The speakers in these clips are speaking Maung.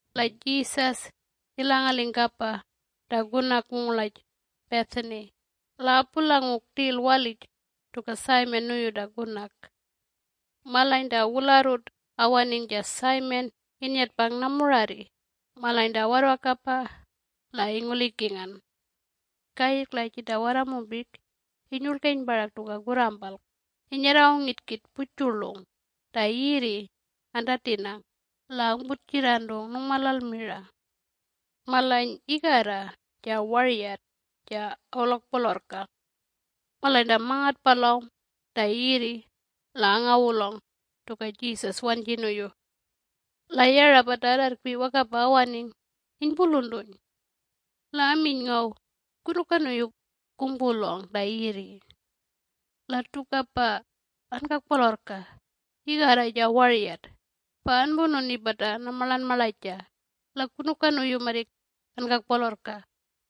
La Jesus ilangaling kapa ta kunak wungurlaj Bethany la apulangung rtil walij tuka Simon nuyu ta kunak. (Malany ta wularrut awaning ja Simon innyatpang namurarri malany ta warrwakapa la ingulikingan.) Kayirrk la jita warramumpik inyurlgeny parak tuka kurrampalk inyarrangung yitkit pujurlung ta yirri antatinang la angputjirrantung nungmalal mira. Malany igarra ja waryat ja awulokpolorrkang. Malany ta mangatpalawng ta yirri la angawulawng tuka Jesus wanji nuyu. La yara pata arrarrkpi wakapa awaning inypuluntuny. La aminy ngaw, “Kunuka nuyu kungpulawng ta yirri? La tukapa ankakpolorrka igarra ja waryat pa anpununi pata namarlanmarlaja la kunuka nuyu marrik ankakpolorrka?”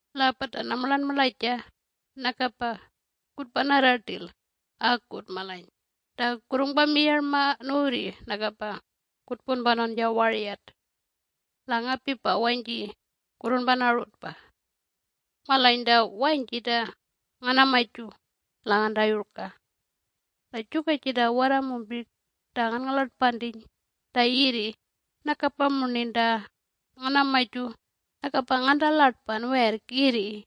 La pata namarlanmarlaja nakapa kutpanarra rtil akut malany ta kurrungpamiyarma nuwurri nakapa kutpunpanawn ja waryat. La ngapipa wanyji kurrunpanarutpa! Malany ta wanyji ta nganamaju la ngantayurka. La juka jita warramumpik ta nganngalartpantiny ta yirri nakapa murnin ta nganamaju nakapa ngantarlatpan werrk yirri.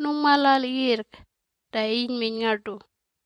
Nungmalal yirrk ta inyminy ngartu.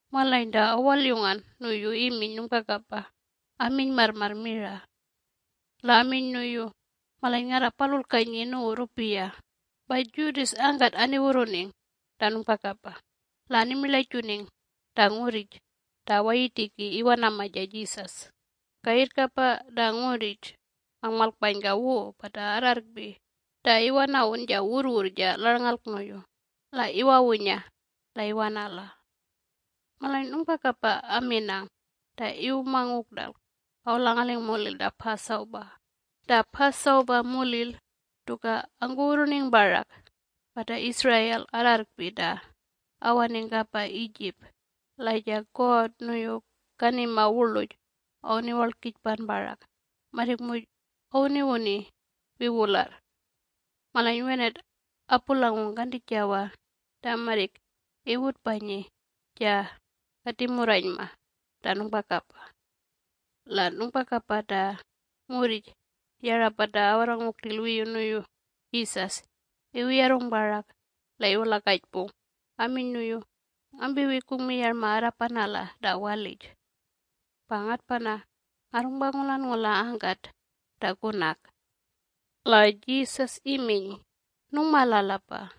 Malany ta awalyungan nuyu iminy nungpakapa aminy marrmarr mira. La aminy nuyu, “Malany ngarrapalulkanyi nuwu rrupiya.” Pa Judas angkat aniwurruning ta nungpakapa la animirlajuning ta ngurrij ta awayirtiki iwanama ja Jesus. Kayirrkapa ta ngurrij angmalkpanyka wu pata arrarrkpi ta iwanawun ja wurrwurr ja larlngalk nuyu la iwawunya la iwanala. Malany nungpakapa aminang ta iwumangung rtalk awulangaling mulil ta Passover (Ta Passover mulil tuka angkuwurruning parak pata Israel arrarrkpi ta awaning kapa Egypt la ja God nuyu kanima wurluj awuniwarlkijpan parak marrik muj awuniwuni wiwularr). Malany wenat apulangung kantijawa ta marrik iwutpanyi ja katimurranyma ta nungpakapa. La nungpakapa ta ngurrij yara pata awarrangung rtil wiyu nuyu Jesus iwuyarrung parak la iwulakajpung aminy nuyu, “Ngampiwi kungmiyarma arrapanala ta walij. Pa ngatpana ngarrungpangulanngula angkat ta kunak.” La Jesus iminy, “Nungmalalapa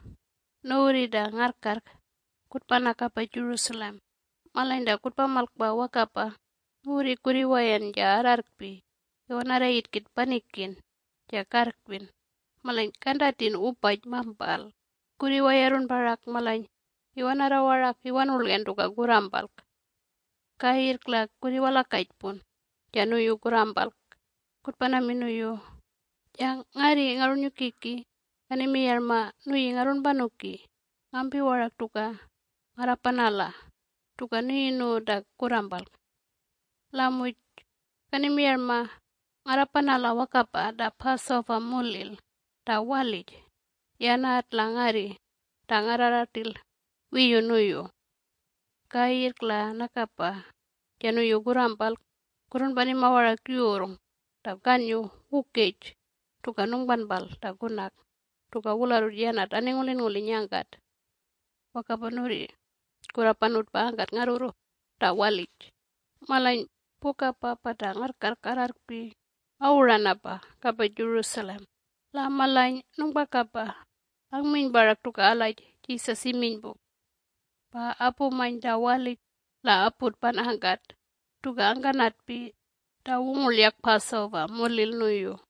nuwurri ta ngarrkarrk kutpana kapa Jerusalem, malany ta kutpamalkpa wakapa nuwurri kurriwayan ja arrarrkpi iwanarra yitkit panikin ja karrkpin malany kantatin wupaj mampal. Kurriwayarrun parak malany iwanarra warak iwanurlgen tuka kurrampalk. Kayirrk la kurriwalakajpun ja nuyu kurrampalk kutpanamin nuyu, ‘Ja ngarri Ngarrunnyukiki kanimiyarma nuyi ngarrunpanuki ngampi warak tuka ngarrapanala tuka nuyi nuwu ta kurrampalk. La muj kanimiyarma ngarrapanala wakapa ta Passover mulil ta walij yanat la ngarri ta ngarrarra rtil wiyu nuyu.’ Kayirrk la nakapa ja nuyu kurrampalk kurrunpanima warak yurrng ta kannyu wukaj tuka nungpanpal ta kunak tuka wularrut yanat aningulinnguliny angkat. Wakapa nuwurri kurrapanutpa angkat ngarrurru ta walij.” Malany pukapa pata ngarrkarrk arrarrkpi awuranapa kapa Jerusalem. La malany nungpakapa angminy parak tuka algaj Jesus iminy pu. Pa apumany ta walij la aputpan angkat tuka angkanatpi ta wungurlyak Passover mulil nuyu.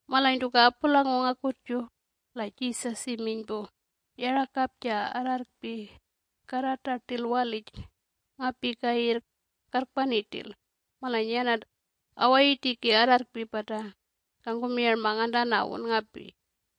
Malany tuka apulangung akutju, la Jesus iminy pu, “Yarakap ja arrarrkpi karrata rtil walij ngapi kayirrk karrpani rtil, malany yanat awayirtiki arrarrkpi pata kangkumiyarma ngantanawun ngapi.”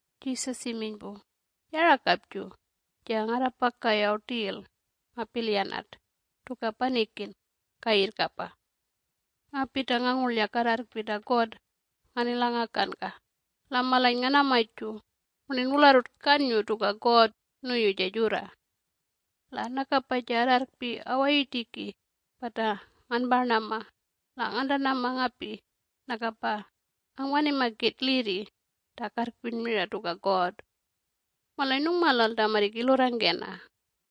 Jesus iminy pu, “Yarakapju ja ngarrapaka yaw rtil ngapilyanat tuka panikin kayirrkapa. Ngapi ta ngangurlyak arrarrkpi ta God nganilangakanka la malany nganamaju murnin wularrut kanyu tuka God nuyu ja jurra. La nukapa ja arrarrkpi awayirtiki pata nganparnama la ngantanama ngapi nakapa angpanima kit lirri ta karrkpin mira tuka God! Malany nungmalal ta marrik ilurrangkena.”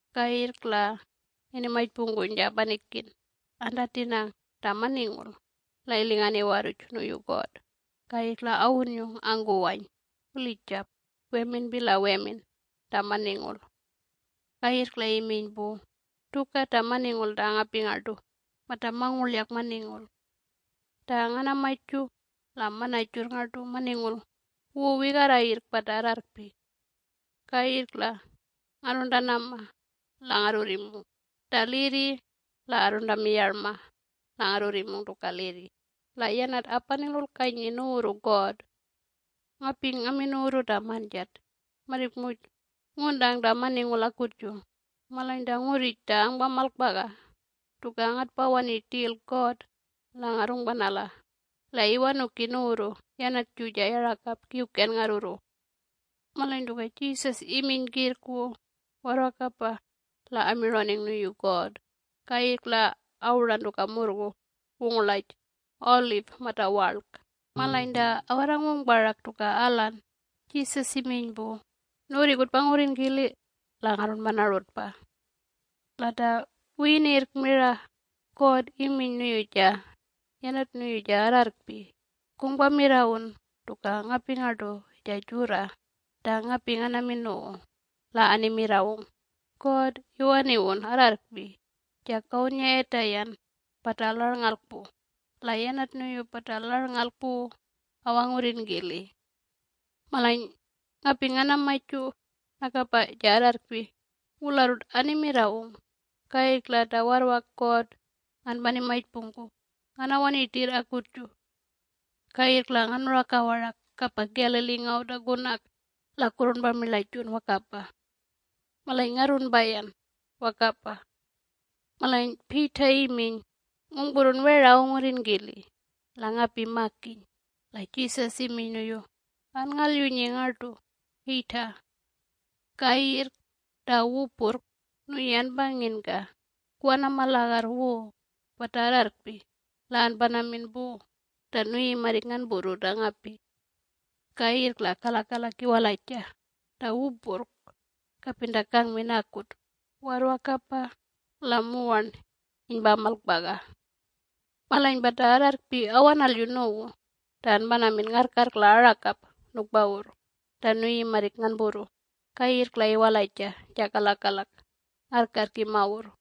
Kayirrk la inimajpungkuny ja panikin antatinang ta maningul la ilingan iwarruj nuyu God, kayirrk la awunnyung angkuwany wulijap weminpi la wemin ta maningul. Kayirrk la iminy pu, “Tuka ta maningul ta ngapi ngartu mata mangurlyak maningul. Ta nganamaju la mana jurr ngartu maningul wu wigarra yirrk pata arrarrkpi. Kayirrk la ngarruntanama la ngarrurrimung ta lirri la arruntamiyarma la ngarrurrimung tuka lirri la yanat apanilulkanyi nuwurru God. Ngapi ngamin nuwurru ta manjat, marrik muj nguntang ta maningul akutju, malany ta ngurrij ta angpamalkpaga tuka ngatpawani rtil God la ngarrungpanala la iwanuki nuwurru yanatju ja yarakap Kiwken ngarrurru.” Malany tuka Jesus iminy kirrk wu warrwakapa la amirawning nuyu God, kayirrk la awuran tuka murrgu wungurlaj Olive mata Warlk. Malany ta awarrangung parak tuka alan, Jesus iminy pu, “Nuwurri kutpangurrin kili la ngarrunpanarutpa. La ta wiyiniyirrk mira God iminy nuyu ja yanat nuyu ja arrarrkpi, ‘Kungpamirrawun tuka ngapi ngartu ja jurra ta ngapi nganamin nuwu.’ La animirrawung: ‘God iwaniwun arrarrkpi ja kawunnyayatayan pata larlngalk pu, la yanat nuyu pata larlngalk pu awangurrin kili.’ Malany ngapi nganamaju, nakapa ja arrarrkpi wularrut animirrawung, kayirrk la ta warrwak God nganpanimajpungku nganawani rtirr akutju. Kayirrk la nganuraka warak kapa Galilee ngaw ta kunak la kurrunpamirlajun wakapa. Malany ngarrunpayan wakapa.” Malany Peter iminy, “Ngungpurrun wera awangurrin kili la ngapi makiny!” La Jesus iminy nuyu, “Anngalyunyi ngartu, Peter. Kayirrk ta wupurrk nuyi anpanginka kuwanama lagarr wu pata arrarrkpi la anpanamin pu ta nuyi marrik nganpurru ta ngapi. Kayirrk la kalakalak iwalaja ta wupurrk, kapin ta kangmin akut warrwakapa la muwarn inypamalkpaga. Malany pata arrarrkpi awanalyu nuwu ta anpanamin ngarrkarrk la arakap nukpawurr ta nuyi marrik nganpurru kayirrk la iwalaja ja kalakalak ngarrkarrk imawurr.”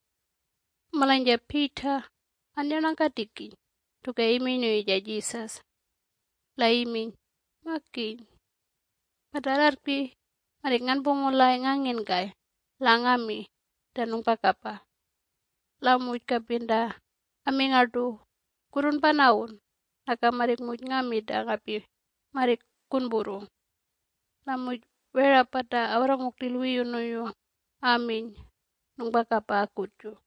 Malany ja Peter annyarnangkatikiny tuka iminy nuyu ja Jesus. La iminy, “Makiny! Pata arrarrkpi marrik nganpungulay nganginkay la ngami ta nungpakapa. La muj kapin ta ami ngartu ‘kurrunpanawun,’ naka marrik muj ngami ta ngapi marrik kunpurru.” La muj wera pata awarrangung rtil wiyu nuyu aminy nungpakapa akutju.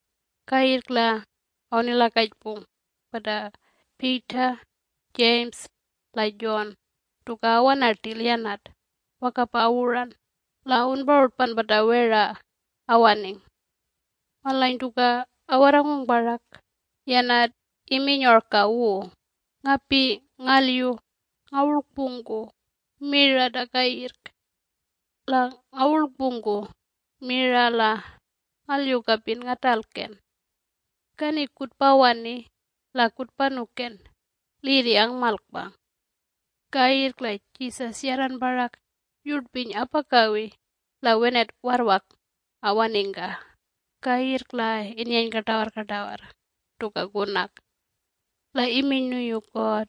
Kayirrk la awunilakajpung pata Peter, James la John tuka awana rtil yanat, wakapa awuran la awunparutpan pata wera awaning. Malany tuka awarrangung parak, yanat iminy orka wu, “Ngapi ngalyu ngawurlkpungku mira ta kayirrk. La ngawurlkpungku mira la ngalyu kapin ngatalken! Kani kutpawani la kutpanuken lirri angmalkpang.” Kayirrk la Jesus yarran parak yurtpiny apakawi la wenat warrwak awaningka kayirrk la innyeny kartawarrkartawarr tuka kunak. La iminy nuyu God,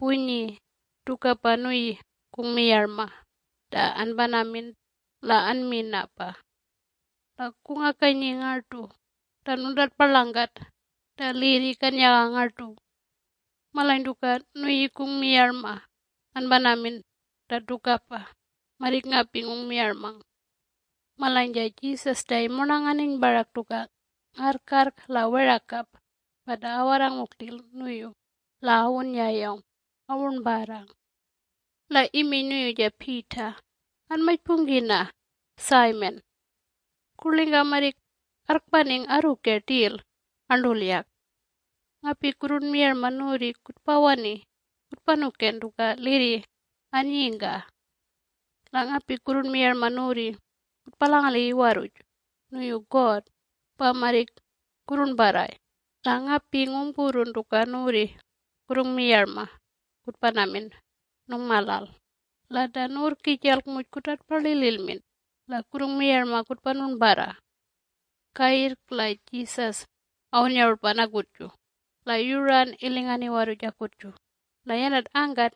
“Punyi tukapa nuyi kungmiyarma ta anpanamin la anminapa. La kungakanyi ngartu ta nuntatparlangkat ta lirri kannyaga ngartu. Malany tuka nuyi kungmiyarma anpanamin ta tukapa, marrik ngapi ngungmiyarmang.” Malany ja Jesus ta imurnanganiny parak tuka ngarrkarrk la werakap pata awarrangung rtil nuyu la awunnyayawng awurnparrang. La iminy nuyu ja Peter, “Anmajpungkina Simon. Kurlingka marrik arrkpaning arruke rtil arntulyak. Ngapi kurrunmiyarma nuwurri kutpawani kutpanuken tuka lirri annyingka. La ngapi kurrunmiyarma nuwurri kutpalangali iwarruj nuyu God pa marrik kurrurnparray. La ngapi ngungpurrun tuka nuwurri kurrungmiyarma kutpanamin nungmalal, la ta nuwurrkijalk muj kutartpalililmin la kurrungmiyarma kutpanurnparra.” Kayirrk la Jesus awunnyarutpan akutju, la yuran ilingan iwarruj akutju. La yanat angkat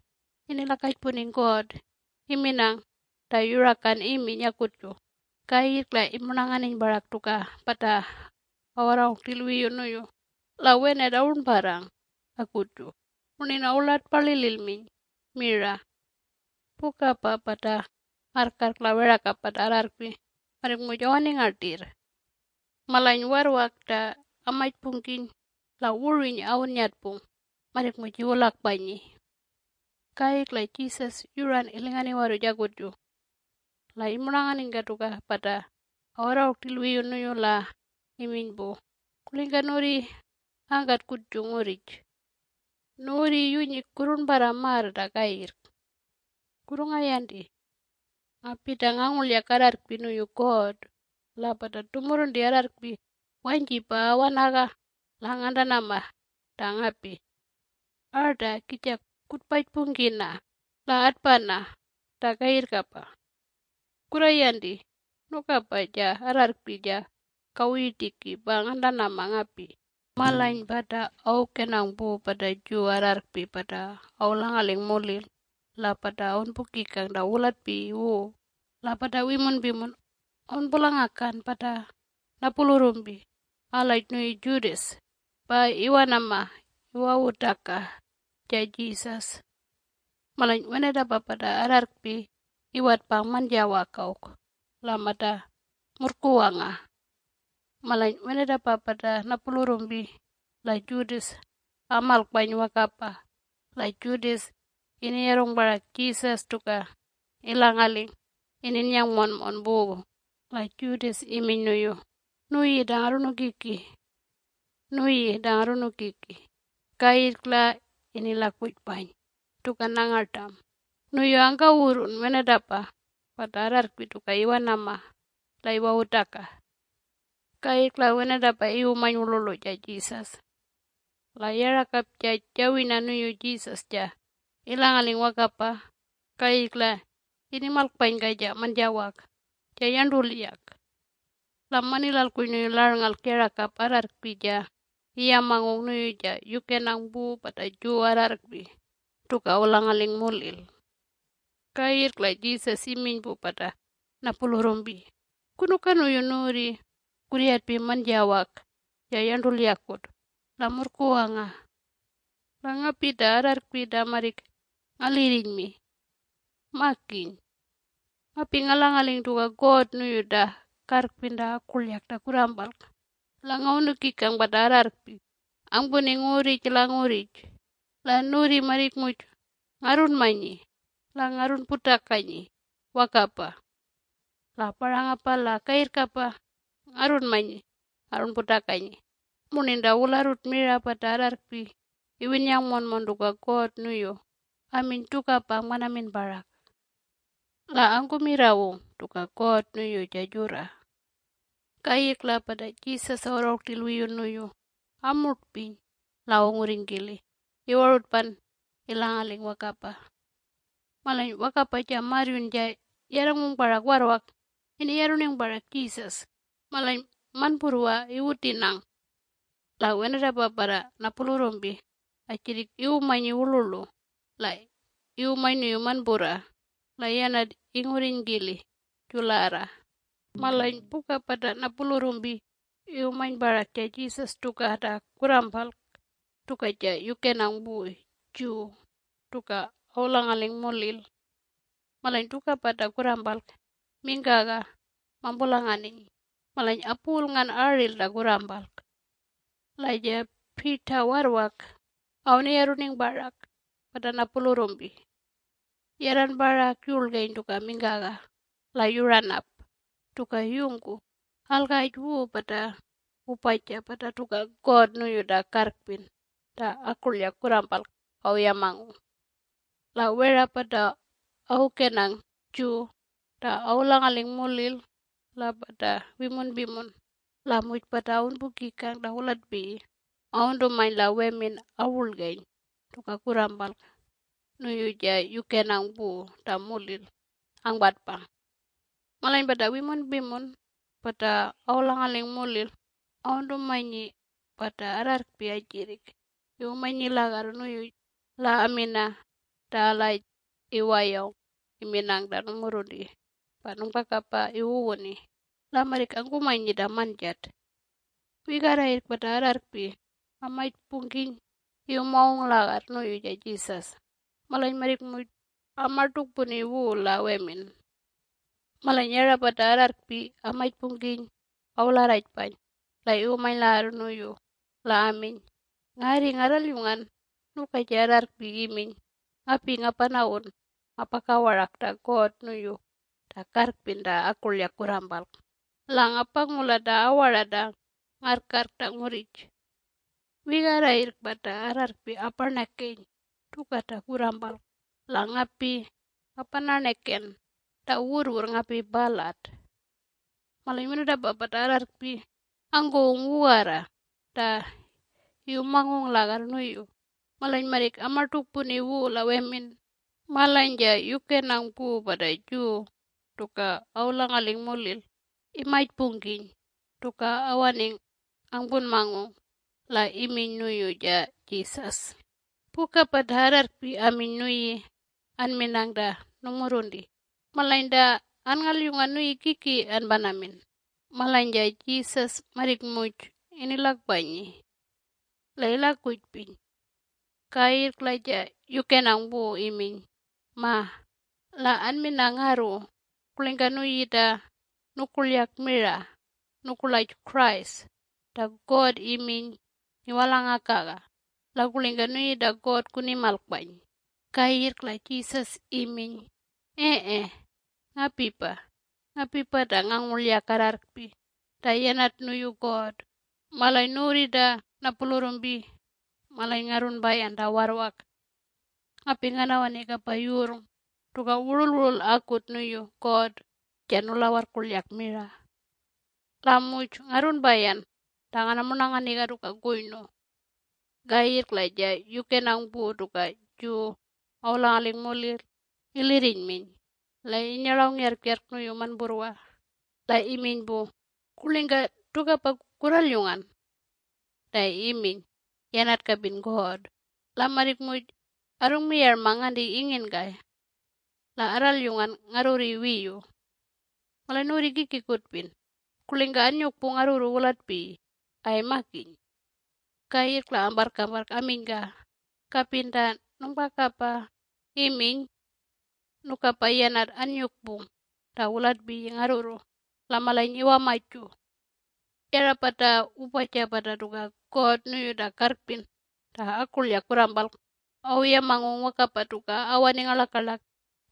inilakajpuning God iminang ta yurakan iminy akutju. Kayirrk la imurnanganiny parak tuka pata awarrangung rtil wiyu nuyu la wenat awurnparrang akutju, murnin awulartparlililminy mira. Pukapa pata ngarrkarrk la werakap pata arrarrkpi marrik muj awaninga rtirr. Malany warrwak ta amajpungkiny la wurwiny awunnyatpung marrik muj iwulakpanyi. Kayirrk la Jesus yuran ilingan iwarruj akutju. La imurnanganinyka tuka pata awarrangung rtil wiyu nuyu la iminy pu, “Kurlingka nuwurri angkat kutju ngurrij? Nuwurri yunyi kurrurnparra marr ta kayirrk. Kurrungayanti! Ngapi ta ngangurlyak arrarrkpi nuyu God la pata tumurrunti arrarrkpi wanyjipa awanaga la ngantanama ta ngapi. Arta, kija kutpajpungkina, la atpana ta kayirrkapa. Kurrayanti nukapa ja arrarrkpi ja kawuyirtiki pa ngantanama ngapi.” Malany pata awukenang pu pata Jew arrarrkpi pata awulangaling mulil la pata awunpukikang ta wulatpiyi wu la pata wimunpimun awunpulangakan pata napulurrumpi algaj nuyu Judas pa iwanama iwawutaka ja Jesus. Malany wenatapa pata arrarrkpi iwatpang manjawak awk la mata murrkuwanga. Malany wenatapa pata napulurrumpi la Judas amalkpany wakapa la Judas iniyarrung parak Jesus tuka ilangaling ininnyang monmon pu la Judas iminy nuyu, “Nuyi ta Ngarrunukiki. Nuyi ta Ngarrunukiki,” kayirrk la inilakujpany tuka nangartam, nuyu angkawurrun wenatapa pata arrarrkpi tuka iwanama la iwawutaka. Kayirrk la wenatapa iwumany wurlurlu ja Jesus. La yarakap ja jawirna nuyu Jesus ja ilangaling wakapa kayirrk la inimalkpanyka ja manjawak ja yarntulyak. La manilalkuny nuyu larlngalk yarakap arrarrkpi ja iyamangung nuyu ja yukenang pu pata Jew arrarrkpi tuka awulangaling mulil. Kayirrk la Jesus iminy pu pata napulurrumpi, “Kunuka nuyu nuwurri kurryatpi manjawak ja yarntulyakut la murrkuwanga? La ngapi ta arrarrkpi ta marrik ngalirrinymi! Makiny! Ngapi ngalangaling tuka God nuyu ta karrpin mira ta akurlyak ta kurrampalk la ngawunukikang pata arrarrkpi angpuning ngurrij la ngurrij, la nuwurri marrik muj ngarrunmanyi la ngarrunputakanyi wakapa. La parangapa la kayirrkapa ngarrunmanyi ngarrunputakanyi, murnin ta wularrut mira pata arrarrkpi iwinnyang monmon tuka God nuyu aminy tukapa angpanamin parak. La angkumirrawung tuka God nuyu ja jurra.” Kayirrk la pata Jesus awarrangung rtil wiyu nuyu amurtpiny la awungurrinykili iwarutpan ilangaling wakapa. Malany wakapa ja marryun ja yarrangung parak warrwak iniyarrukuning parak Jesus, malany manpurrwa iwutinang. La wenatapa pata napulurrumpi ajirrik iwumanyi wurlurlu, la iwumany nuyu manpurra la yanat ingurriny kili jularra. Malany puka pata napulurrumpi iwumany parak ja Jesus tuka ta kurrampalk tuka ja yukenang pu Jew tuka awulangaling mulil. Malany tukapa ta kurrampalk mingkaga mampulanganiny malany apuwulngan aril ta kurrampalk. La ja Peter warrwak awunyarruning parak pata napulurrumpi. Yarran parak yurlgeny tuka mingkaga la yuran ap tuka yungku algaj wu pata wupaja pata tuka God nuyu ta karrpin mira ta akurlyak kurrampalk awuyamangung. La wera pata awukenang Jew ta awulangaling mulil la pata wimunpimun la muj pata awunpukikang ta wulatpiyi awuntumany la wemin awurlgeny tuka kurrampalk nuyu ja yukenang pu ta mulil angpatpang. Malany pata wimunpimun pata awulangaling mulil awuntumanyi pata arrarrkpi ajirrik iwumanyi lagarr nuyu la amina ta algaj iwayawng iminang ta nungmurrunti pa nungpakapa iwuwuni, la marrik angpunmanyi ta manjat. Wigarra yirrk pata arrarrkpi amajpungkiny iwumangung lagarr nuyu ja Jesus, malany marrik muj amartukpuni wu la wemin. Malany yara pata arrarrkpi amajpungkiny awularrajpany la iwumany lagarr nuyu. La aminy, “Ngarri ngarralyungan nuka ja arrarrkpi iminy, ‘Ngapi ngapanawun ngapaka warak ta God nuyu ta karrpin mira ta akurlyak kurrampalk la ngapangula ta awara ta ngarrkarrk ta ngurrij. Wigarra yirrk pata arrarrkpi aparnakeny tuka ta kurrampalk la ngapi ngapanarnaken ta wurrwurr ngapi palat.’” Malany wenatapa pata arrarrkpi angkuwung wugarra ta iwumangung lagarr nuyu malany marrik amartukpuni wu la wemin. Malany ja yukenang pu pata Jew tuka awulangaling mulil imajpungkiny tuka awaning angpunmangung la iminy nuyu ja Jesus, “Puka pata arrarrkpi aminy nuyi anminang ta nungmurrunti. Malany ta anngalyungan nuyi kiki anpanamin?” Malany ja Jesus marrik muj inilakpanyi. La ilakujpiny. Kayirrk la ja yukenang pu iminy, “Ma, la anmina ngarru: Kurlingka nuyi ta nukurkyak mira nukurlaj Christ, ta God iminy ngiwalangakaga? La kurlingka nuyi ta God kunimalkpany?” Kayirrk la Jesus iminy, “Ee, ngapipa. Ngapipa ta ngangurlyak arrarrkpi ta yanat nuyu God, malany nuwurri ta napulurrumpi malany ngarrunpayan ta warrwak. Ngapi nganawani kapa yurrng tuka wurulwurul akut nuyu God, ja nulawarrkurlyak mira. La muj ngarrunpayan ta nganamurnanganiga tuka kuynu.” Kayirrk la ja yukenang pu tuka Jew awulangaling mulil ilirrinyminy la innyarlawng yarrjarrk nuyu manpurra la iminy pu, “Kurlingka tukapa kurralyungan? Ta iminy yanat kapin God! La marrik muj arrungmiyarmang nganti inginkay. La arralyungan ngarrurri wiyu. Malany nuwurri kiki kutpin, kurlingka annyukpung ngarrurru wulatpiyi ay makiny?” Kayirrk la amparrkamparrk aminyka, “Kapin ta nungpakapa iminy. Nukapa yanat annyukpung ta wulatpiyi ngarrurru la malany iwamaju.” Yara pata wupaja pata tuka God nuyu ta karrpin mira ta akurlyak kurrampalk awuyamangung wakapa tuka awaning ngarlakalak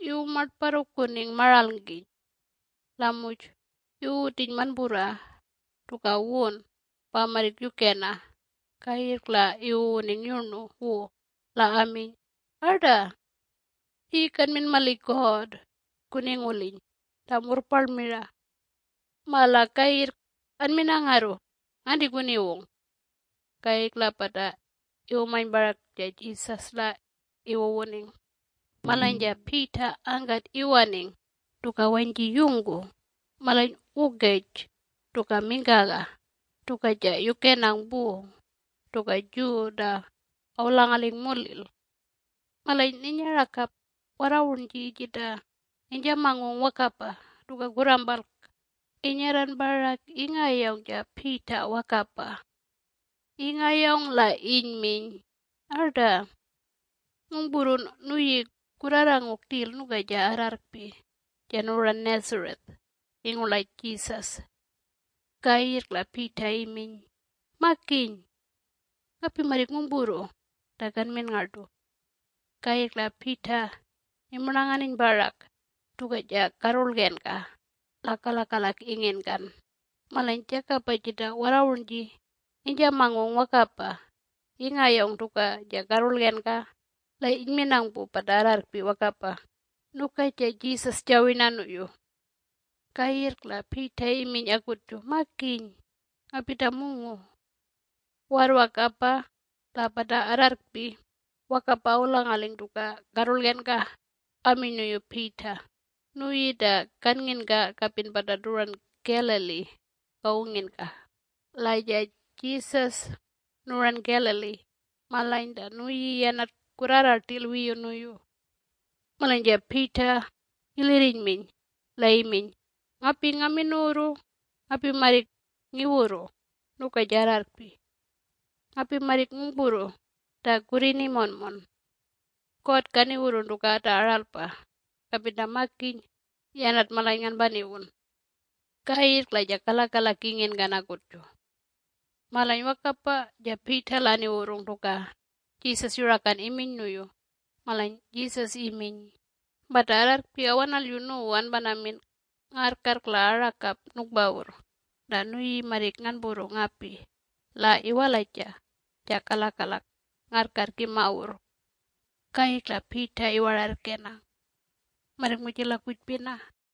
iwumartparrukuning maralngkiny. La muj iwuwutiny manpurra tuka wun pa marrik yukena, kayirrk la iwuwuning yurnu wu la aminy, “Arta! Nuyi kanmin mali God kuninguliny ta murrparl mira. Ma la kayirrk anmina ngarru, nganti kuniwung?” Kayirrk la pata iwumany parak ja Jesus la iwuwuning. Malany ja Peter angkat iwaning tuka wanyji yungku malany wukej tuka mingkaga tuka ja yukenang pu tuka Jew ta awulangaling mulil. Malany ninyarakap warrawurnji jita inyjamangung wakapa tuka kurrampalk inyarran parak ingayawng ja Peter wakapa. Ingayawng la inyminy, “Arta. Ngungpurrun nuyi kurrarrangung rtil nuka ja arrarrkpi ja nuwuran Nazareth ingurlaj Jesus?” Kayirrk la Peter iminy, “Makiny! Ngapi marrik ngungpurru ta kanmin ngartu.” Kayirrk la Peter imurnanganiny parak tuka ja karrurlgenka la kalakalak inginkan. Malany jakapa jita warrawurnji inyjamangung wakapa ingayawng tuka ja karrurlgenka la inyminang pu pata arrarrkpi wakapa, “Nuka ja Jesus jawirna nuyu.” Kayirrk la Peter iminy akutju, “Makiny ngapi ta mungu!” Warrwakapa la pata arrarrkpi wakapa awulangaling tuka karrurlgenka aminy nuyu Peter, “Nuyi ta kannginka kapin pata tuwuran Galilee kawunginka, la ja Jesus nuwuran Galilee, malany ta nuyi yanat kurrarra rtil wiyu nuyu.” Malany ja Peter ilirrinyminy la iminy, “Ngapi ngamin nuwurru ngapi marrik ngiwurru nuka ja arrarrkpi! Ngapi marrik ngungpurru ta kurruni monmon! God kaniwurrun tuka ta aralpa, kapin ta makiny yanat malany nganpaniwun!” Kayirrk la ja kalakalak inginkan akutju. Malany wakapa ja Peter la aniwurrung tuka Jesus yurakan iminy nuyu malany Jesus iminy, “Pata arrarrkpi awanalyu nuwu anpanamin ngarrkarrk la arakap nukpawurr ta nuyi marrik nganpurru ngapi la iwalaja ja kalakalak ngarrkarrk imawurr.” Kayirrk la Peter iwararrkenang. Marrik muj ilakujpina.